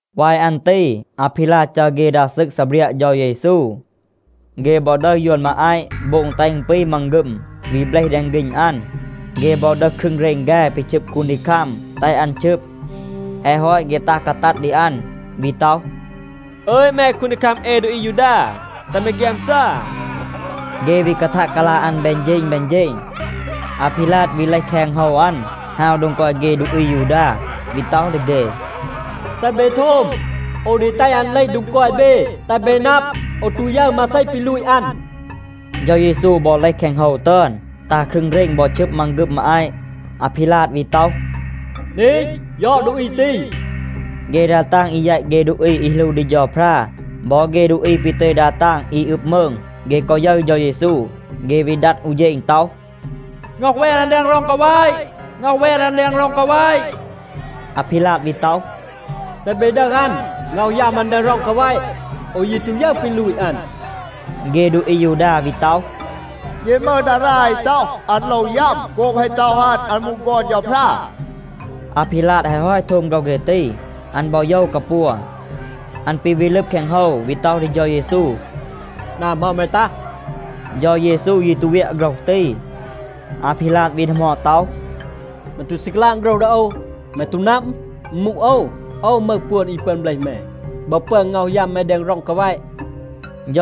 วาย อัน ตี อาพีลาด จัร เฆ ดา ซึก ซีเบรียะ เฌา เยซู. เฆ บอ ดึห ยวน มาอาต, โบง แตห อึณ ปี มังฆึม, วี เบลห แดง ฆีณ อัน. เฆ บอ ดึห ครึง เรณ แฆ ปี ชึบ คูนดีคัม, แตห อัน ชึบ. แฮะ ฮอต เฆ ตัห กาตัด ดี อัน วี ต็อห, “อึย แม คูนดีคัม เอ ดูอี อายูดา, แตห แม ฆยามซา.” เฆ วี กาทัะ กาลา อัน แบน เฌณ แบน เฌณ. อาพีลาด วี เลห แคง โฮว อัน, ฮาว โดง กอย เฆ ดูอี อายูดา, วี ต็อห ดี เฆ, “แตห เบ โทม. โอว ดี แตห อัน เลห โดง กอย เบ, แตห เบ นับ, โอว ตู ยึร มาเซ ปี ลูต อัน.” เฌา เยซู บอ เลห แคง โฮว ตึอน, ตา ครึง เรณ บอ ชึบ มังฆึม มาอาต. อาพีลาด วี ต็อห, “นี, ยอด ดูอี ตี.” เฆ ดา ตาง อี แยต เฆ ดูอี อี หลู ดี เฌาพรา บอ เฆ ดูอี ปี ตึย ดา ตาง อี อึบ มืง, เฆ กอ ยึร เฌา เยซู, เฆ วี ดัด อู เฌณ ต็อห, “ง็อห แวน อัน แดง ร็อง กาแวะ. ง็อห แวน อัน แดง ร็อง กาแวะ.” อาพีลาด วี ต็อห, “แตห เบ ดึห อัน, ง็อห ยัม อัน แดง ร็อง กาแวะ. โอว ยี ตู ยึร ปี ลูต อัน.” เฆ ดูอี อายูดา วี ต็อห, “เย มึห ดารา อี ต็อห, อัน โลว ยัม โกบ แฮะ ต็อห อัน, อัน มูห ฆอน เฌาพรา.” อาพีลาด แฮะ ฮอต โทม โฆรห เฆ ตี, อัน บอ โยว กาปัว. อัน ปี วี ลึบ แคง โฮว วี ต็อห ดี เฌา เยซู, “นา เหมา แม ตัห?” เฌา เยซู ยี ตู เวียะ โฆรห ตี. อาพีลาด วี ดีหมอด ต็อห, “แม ตู ซี กาลาง โฆรห ดี โอว? แม ตู นับ, อึณ มูห โอว, โอว มึห ปวน อี ปึอน เบลห แม บอ ปึอน ง็อห ยัม แม แดง ร็อง กาแวะ?”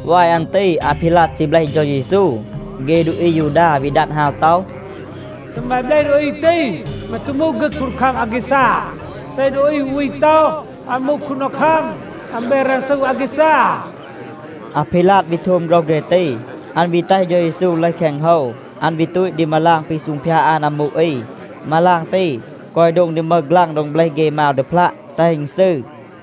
วาย อัน ตี อาพีลาด ซี เบลห เฌา เยซู. เฆ ดูอี อายูดา วี ดัด ฮาว ต็อห, “เซ แม เบลห ดูอี ตี, แม ตู มูห ฆึก คูนดีคัม อาแกซา. เซ ดูอี อู วี ต็อห, อัน มูห คูนดีคัม, อัน แบน รันซู อาแกซา.” อาพีลาด วี โทม โฆรห เฆ ตี, อัน วี แตห เฌา เยซู เลห แคง โฮว. อัน วี ตูต ดี มาลาง ปี ซูงพยาด อัน อามู อี. มาลาง ตี กอย โดง ดี มึห ฆลัง โดง เบลห เฆ มาว ดีพลัะ, แตห อึณ ซืร.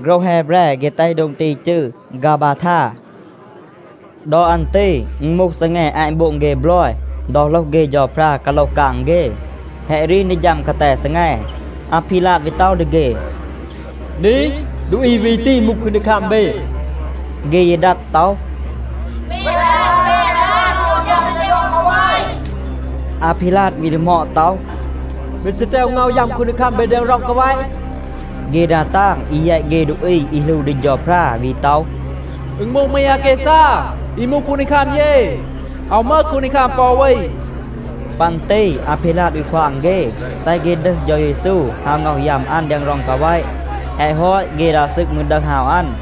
โฆรห แฮแบร เฆ แตห โดง ตี จืร “ฆาบาทา.” ดอ อัน ตี อึณ มูห ซีแง อาต โบง เฆ บลอย ดอ โหลห เฆ เฌาพรา กาโลห กาง เฆ. แฮะ รีน ดี ฌัม กาแต ซีแง. อาพีลาด วี ต็อห ดี เฆ, “นี, ดูอี วี ตี มูห คูนดีคัม เบ.” เฆ ยี ดัด ต็อห, “แวน อัน, แวน อัน. ง็อห ยัม อัน แดง ร็อง กาแวะ.” อาพีลาด วี ดีหมอด ต็อห, “เบ ซี แตห โอว ง็อห ยัม คูนดีคัม เบ แดง ร็อง กาแวะ?” เฆ ดา ตาง อี แยต เฆ ดูอี อี หลู ดี เฌาพรา วี ต็อห, “อึณ มูห มี อาแกซา, อี มูห คูนดีคัม เย. อาว มึห คูนดีคัม ปอ อู วี.” ปัน ตี อาพีลาด วี ควาง เฆ, แตห เฆ ดึห เฌา เยซู ฮาว ง็อห ยัม อัน แดง ร็อง กาแวะ. แฮะ ฮอต, เฆ ดา ซึก มืร ดึห ฮาว อัน.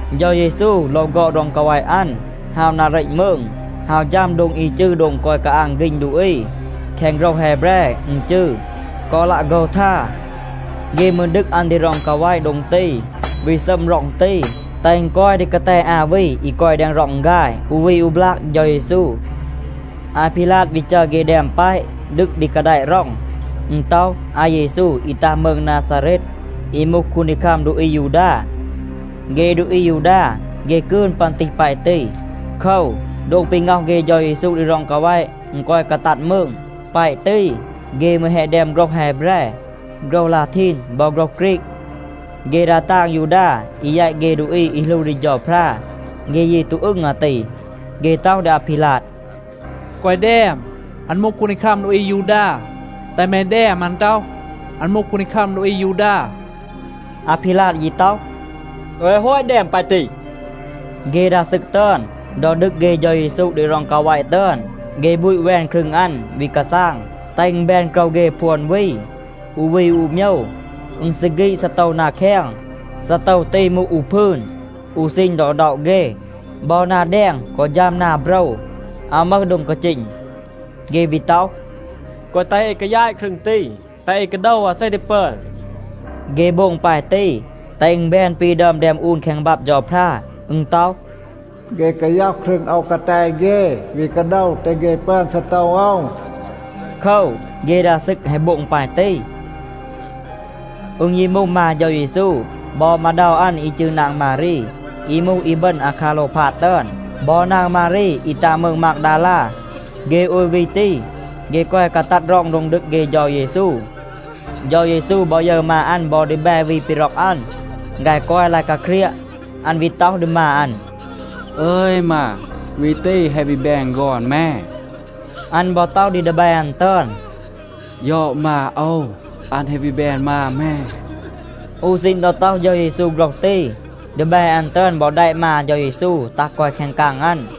เฌา เยซู โลว ฆอด ร็อง กาแวะ อัน, ฮาว นา เรต มืง, ฮาว ฌัม โดง อี จืร โดง กอย กาอาง ฆีณ ดูอี. แคง โฆรห แฮแบร อึณ จืร “ฆอลัะโฆทา.” เฆ มืร ดึก อัน ดี ร็อง กาแวะ โดง ตี, วี ซัม ร็อง ตี, แตห อึณ กอย ดี กาแต อา วี อี กอย แดง ร็อง ฆาย, อู วี อู บลาก เฌา เยซู. อาพีลาด วี จัร เฆ แดม แปะ ดึก ดี กาแดะ ร็อง. อึณ ต็อห, “อาเยซู, อี ตัห มืง นาซาเรต, อี มูห คูนดีคัม ดูอี อายูดา.” เฆ ดูอี อายูดา, เฆ กืน ปึอน ตีห แปะ ตี. โคว, โดง ปี ง็อห เฆ เฌา เยซู ดี ร็อง กาแวะ, อึณ กอย กาตัด มืง. แปะ ตี เฆ มืร แฮะ แดม โฆรห แฮแบร, โฆรห ลาทีน บอ โฆรห ฆรีก. เฆ ดา ตาง ยูดา อี แยต เฆ ดูอี อี หลู ดี เฌาพรา, เฆ ยี ตู อึง อาตี. เฆ ต็อห ดี อาพีลาด, “แกวะ แดม ‘อัน มูห คูนดีคัม ดูอี อายูดา.’ แตห แม แดม, อัน ต็อห, ‘อัน มูห คูนดีคัม ดูอี อายูดา.’” อาพีลาด ยี ต็อห, “โอว แฮะ ฮอต แดม ปาย ตี.” เฆ ดา ซึก ตึอน, ดอ ดึก เฆ เฌา เยซู ดี ร็อง กาแวะ ตึอน, เฆ บูต แวน ครึง อัน, วี กาซาง, แตห อึณ แบน โกรว เฆ พวน วี, อู วี อู โมยว. อึณ ซี ฆีด ซีโตว นา แคง. ซีโตว ตี มูห อู พืน อู ซีณ ดอ ด็อะ เฆ, บอ นา แดง กอ ฌัม นา โบรว, อาว มึห โดง กาจีณ. เฆ วี ต็อห, “แกวะ แตห เอ กายาต ครึง ตี. แตห เอ กาโดว, อาเซ ดี ปึอน.” เฆ โบง ปาย ตี แตห อึณ แบน ปี ดึอม แดม อูน แคง บับ เฌาพรา. อึณ ต็อห, “เฆ กาย็อห ครึง โอว กาแต เฆ, วี กาโดว, แตห เฆ ปึอน ซีโตว โอว.” โคว, เฆ ดา ซึก แฮะ โบง ปาย ตี. อึณ ยี มูห มา เฌา เยซู บอ มาเดา อัน อี จืร นาง มารี, อี มูห อีบึณ อาคาโลวพาด ตึอน, บอ นาง มารี, อี ตัห มืง มากดาลา. เฆ โอย วี ตี, เฆ กอย กาตัด ร็อง โดง ดึก เฆ เฌา เยซู. เฌา เยซู บอ ยึร มา อัน บอ ดีแบ วี ปี ร็อก อัน. ฆาย กอย ลาย กาเครียะ. อัน วี ต็อห ดี มา อัน, “อึย มา, วี ตี แฮะ วี แบน ฆอน แม.” อัน บอ ต็อห ดี ดีแบ อัน ตึอน, “ยอด มา โอว, อัน แฮะ วี แบน มา แม.” อู ซีณ ดอ ต็อห เฌา เยซู โฆรห ตี, ดีแบ อัน ตึอน บอ แดะ มา เฌา เยซู ตัห กอย แคง กาง อัน.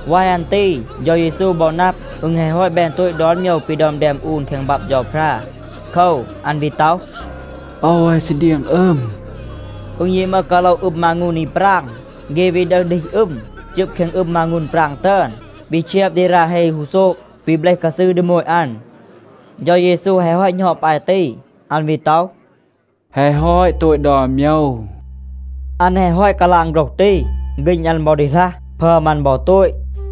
วาย อัน ตี เฌา เยซู บอ นับ, อึณ แฮะ ฮอต แบน โตต ดอน โมยว ปี ดึอม แดม อูน แคง บับ เฌาพรา. โคว, อัน วี ต็อห, “โอว แฮะ ซี เดียง อึม.” อึณ ยี มึห กาโละ อึม มางูน อี ปราง. เฆ วี ดึห ดีห อึม, จึบ แคง อึม มางูน ปราง ตึอน, วี เชียบ ดี รา เฮ ฮูโซบ, วี เบลห กาซืร ดี โมต อัน. เฌา เยซู แฮะ ฮอต หณอด ปาย ตี, อัน วี ต็อห, “แฮะ ฮอต โตต ดอน โมยว.” อัน แฮะ ฮอต กาลาง โฆรห ตี, ฆีณ อัน บอ ดีหลัห, พึอม อัน บอ โตต.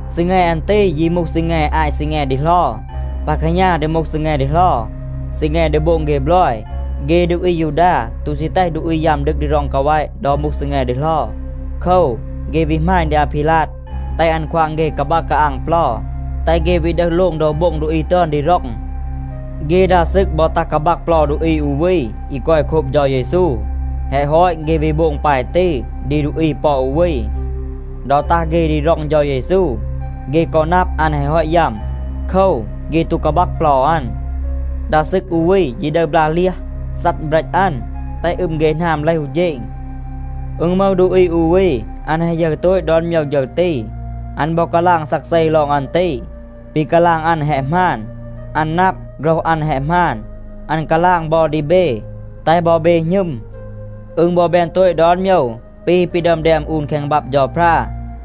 ซีแง อัน ตี ยี มูห ซีแง อาต ซีแง ดีเหลา. ปา แคหณา ดี มูห ซีแง ดีเหลา, ซีแง ดี โบง เฆ บลอย. เฆ ดูอี อายูดา ตู ซี แตห ดูอี ยัม ดึก ดี ร็อง กาแวะ ดอ มูห ซีแง ดีเหลา. โคว, เฆ วี หมาณ ดี อาพีลาด, แตห อัน ควาง เฆ กาบัก กาอาง เปลา, แตห เฆ วี ดึห โลง โดว โบ็ง ดูอี ตึอน ดี ร็อง. เฆ ดา ซึก บอ ตัห กาบัก เปลา ดูอี อู วี, อี กอย โคบ เฌา เยซู. แฮะ ฮอต, เฆ วี โบง ปาย ตี ดี ดูอี ปอ อู วี. ดอ ตัห เฆ ดี ร็อง เฌา เยซู, เฆ กอ นับ, อัน แฮะ ฮอต ยัม. โคว, เฆ ตู กาบัก เปลา อัน. ดา ซึก อู วี ยี ดึห บลา เลียห, ซัด เบรต อัน, แตห อึม เฆ หนาม เลห อู เฌณ. อึณ มึห ดูอี อู วี, อัน แฮะ ยึร โตต ดอน โมยว ฌึร ตี. อัน บอ กาลาง ซักเซ ลอง อัน ตี. ปี กาลาง อัน แฮะ หมาน. อัน นับ, โฆรห อัน แฮะ หมาน. อัน กาลาง บอ ดี เบ, แตห บอ เบ หณึม. อึณ บอ แบน โตต ดอน โมยว ปี ปี ดึอม แดม อูน แคง บับ เฌาพรา.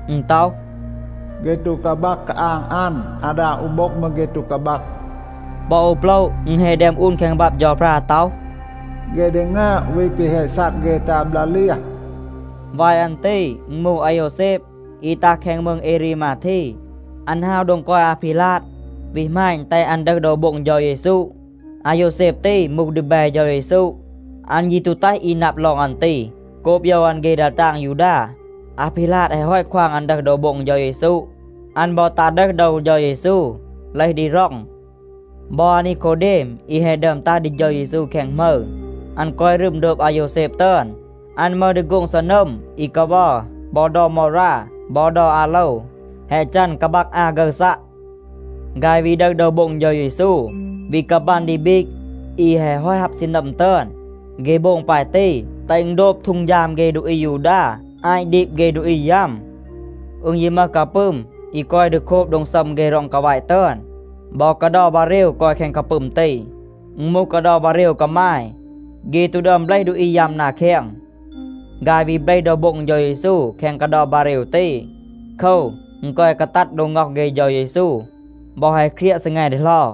อึณ ต็อห, “เฆ ตู กาบัก กาอาง อัน. อาดา อู โบ็ง มืร เฆ ตู กาบัก.” ปอ อู โปละ อึณ แฮะ แดม อูน แคง บับ เฌาพรา ต็อห, “เฆ ดี งึอบ วี แปะ แฮะ ซัด เฆ ตา บลา เลียห.” วาย อัน ตี อึณ มูห อาโยวแซบ, อี ตัห แคง มืง เอรีมาที. อัน ฮาว โดง กอย อาพีลาด วี หมาณ, แตห อัน ดึห โดว โบ็ง เฌา เยซู. อาโยวแซบ ตี มูห ดีแบ เฌา เยซู. อัน ยี ตู แตห อี นับ ลอง อัน ตี โกบ โยว อัน เฆ ดา ตาง ยูดา. อาพีลาด แฮะ ฮอต ควาง อัน ดึห โดว โบ็ง เฌา เยซู, อัน บอ ตัห ดึห โดว เฌา เยซู เลห ดี ร็อง. บอ อานีโคเดม อี แฮะ ดึอม ตัห ดี เฌา เยซู แคง หมึร, อัน กอย รึม โดบ อาโยวแซบ ตึอน. อัน มึห ดี โฆ็ง ซีนัม อี กาวัร บอ เดา มอรา บอ เดา อาโลว, แฮะ จัน กาบัก อา ฆึร ซัะ. ฆาย วี ดึห โดว โบ็ง เฌา เยซู, วี กาบัน ดี บีก อี แฮะ ฮอต ฮับ ซีนัม ตึอน. เฆ โบง ปาย ตี, แตห อึณ โดบ ฮีด เฆ ดูอี อายูดา อาต ดีบ เฆ ดูอี ยัม. อึณ ยี มึห กาปึม อี กอย ดี โคบ โดง ซัม เฆ ร็อง กาแวะ ตึอน. บอ กาเดา บาเรว กอย แคง กาปึม ตี. อึณ มูห กาเดา บาเรว กามาย. เฆ ตู ดึอม เบลห ดูอี ยัม นา แคง. ฆาย วี เบลห โดว โบ็ง เฌา เยซู แคง กาเดา บาเรว ตี. โคว, อึณ กอย กาตัด โดง ง็อห เฆ เฌา เยซู บอ แฮะ เครียะ ซีแง ดีเหลา.